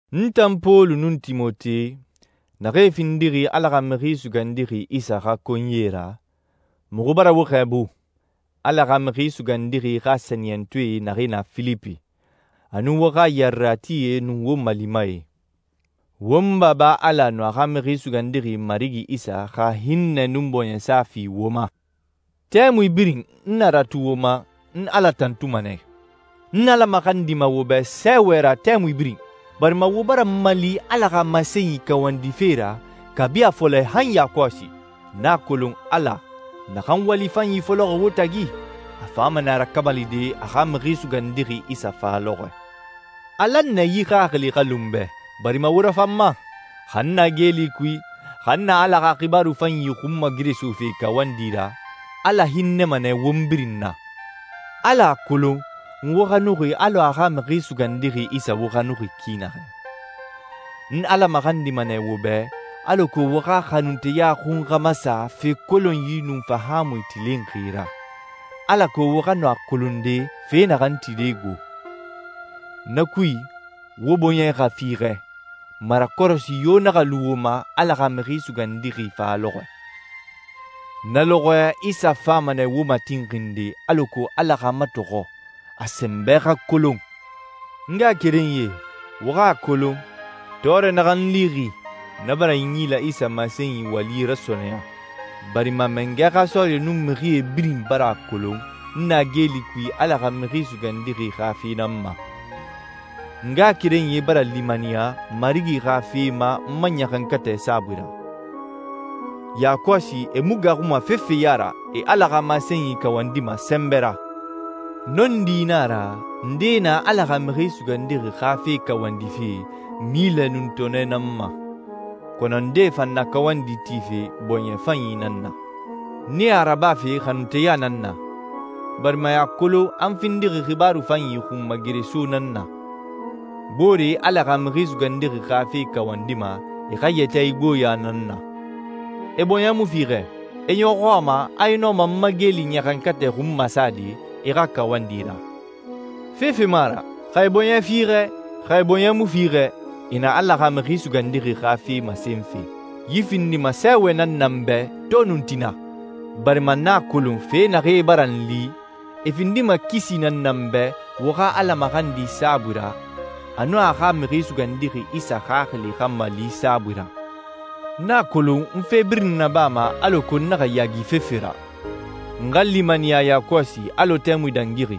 N tan Pɔlu nun Timote, naxee findixi Ala xa Mixi Sugandixi Isa xa konyie ra, muxu bara wo xɛɛbu, Ala xa Mixi Sugandixi xa sɛniyɛntɔɛ naxee na Filipi, a nun wo xa yareratie nun wo malimae. Won Baba Ala nun a xa Mixi Sugandixi Marigi Isa xa hinnɛ nun bɔɲɛsa fi wo ma. Tɛmui birin n na ratu wo ma, n Ala tantuma nɛ. N Ala maxandima wo bɛ sɛɛwɛ ra tɛmui birin, barima wo bara n mali Ala xa masenyi kawandife ra kabi a fɔlɛ han yakɔsi. N a kolon, Ala, naxan wali fanyi fɔlɔxi wo tagi, a fama nɛ a rakamalide a xa Mixi Sugandixi Isa fa lɔxɔɛ. A lan nɛ yi xaxili xa lu n bɛ barima wo rafan n ma. Xa n na geeli kui, xa n na Ala xa xibaaru fanyi xunmageresofe kawandi ra, Ala hinnɛma nɛ won birin na. Ala a kolon n wo xanuxi alɔ a xa Mixi Sugandixi Isa wo xanuxi ki naxɛ. N Ala maxandima nɛ wo bɛ alako wo xa xanunteya xun xa masa fe kolonyi nun fahaamui tilinxi ra, alako wo xa nɔ a kolonde fe naxan tide gbo. Na kui, wo bɔɲɛ xa fiixɛ, marakɔrɔsi yo naxa lu wo ma Ala xa Mixi Sugandixi fa lɔxɔɛ. Na lɔxɔɛ Isa fama nɛ wo matinxinde alako Ala xa matɔxɔ, a sɛnbɛ xa kolon. N ngaxakerenyie, wo xa a kolon, tɔɔrɛ naxan n lixi, na bara Inyila Isa masenyi wali rasɔɔnɛya, barima mangɛ xa sɔɔrie nun mixie birin bara a kolon n na geeli kui Ala xa Mixi Sugandixi xa fe nan ma. N ngaxakerenyie bara limaniya Marigi xa fe ma n ma ɲaxankatɛ saabui ra. Yakɔsi e mu gaaxuma fefe ya ra, e Ala xa masenyi kawandima sɛnbɛ ra. Nɔndi nan a ra, ndee na Ala xa Mixi Sugandixi xa fe kawandife milɛ nun tɔɔnɛ nan ma, kɔnɔ ndee fan na kawandi tife bɔɲɛ fanyi nan na. Nee a rabafe xanunteya nan na, barima e a kolon a n findixi Xibaaru Fanyi xunmagereso nan na. Booree Ala xa Mixi Sugandixi xa fe kawandima e xa yɛtɛ igboɲa nan na. E bɔɲɛ mu fiixɛ. E ɲɔxɔ a ma a e nɔma n ma geeli ɲaxankatɛ xun masade e xa kawandi ra. Fefe mu a ra. Xa e bɔɲɛ fiixɛ, xa e bɔɲɛ mu fiixɛ, e na Ala xa Mixi Sugandixi xa fe masenfe. Yi findima sɛɛwɛ nan na n bɛ to nun tina, barima n a kolon fe naxee bara n li, e findima kisi nan na n bɛ wo xa Ala maxandi saabui ra nun a xa Mixi Sugandixi Isa Xaxili xa mali saabui ra. N a kolon n fe birin nabama alako n naxa yaagi fefe ra. N xa limaniya yakɔsi alɔ tɛmui dangixi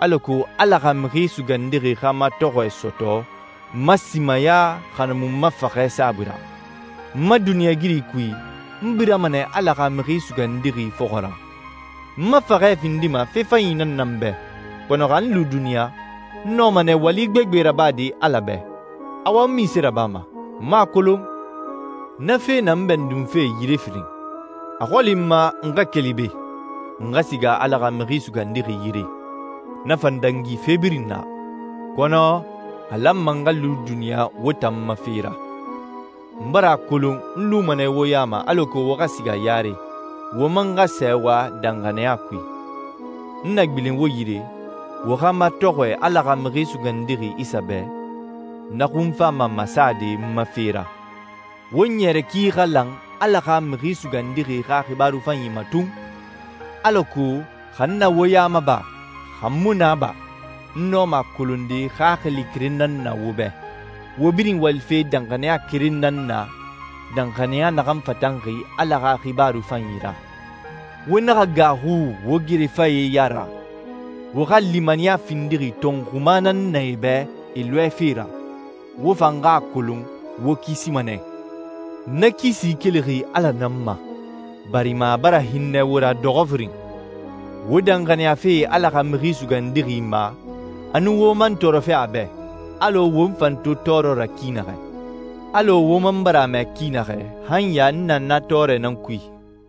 alako Ala xa Mixi Sugandixi xa matɔxɔɛ sɔtɔ n ma simaya xa na mu n ma faxɛ saabui ra. N ma duniɲɛigiri kui, n birama nɛ Ala xa Mixi Sugandixi fɔxɔ ra. N ma faxɛ findima fe fanyi nan na n bɛ, kɔnɔ xa n lu duniɲa, n nɔma nɛ wali gbegbe rabade Ala bɛ. Awa, n munse rabama? N mu a kolon. Na fe na n bɛndunfe yire firin. A xɔli n ma n xa keli be, n xa siga Ala xa Mixi Sugandixi yire. Na fan dangi fe birin na. Kɔnɔ a lanma n xa lu duniɲa wo tan ma fe ra. N bara a kolon n luma nɛ wo ya ma alako wo xa siga yare, wo man xa sɛɛwa danxaniya kui. N na gbilen wo yire, wo xa matɔxɔɛ Ala xa Mixi Sugandixi Isa bɛ, na xun fama masade n ma fe ra. Wo ɲɛrɛ ki xa lan Ala xa Mixi Sugandixi xa Xibaaru Fanyi ma tun, alako xa n na wo ya ma ba, xa n mu na ba, n nɔma a kolonde xaxili keren nan na wo bɛ, wo birin walife danxaniya keren nan na, danxaniya naxan fatanxi Ala xa Xibaaru Fanyi ra. Wo naxa gaaxu wo gerefae ya ra. Wo xa limaniya findixi tɔnxuma nan na e bɛ e lɔɛfe ra, wo fan xa a kolon wo kisima nɛ. Na kisi kelixi Ala nan ma, barima a bara hinnɛ wo ra dɔxɔ firin: Wo danxaniyafe Ala xa Mixi Sugandixi ma, a nun wo man tɔɔrɔfe a bɛ, alɔ wo n fan to tɔɔrɔ ra ki naxɛ. Alɔ wo man bara a mɛ ki naxɛ, han ya n na na tɔɔrɛ nan kui.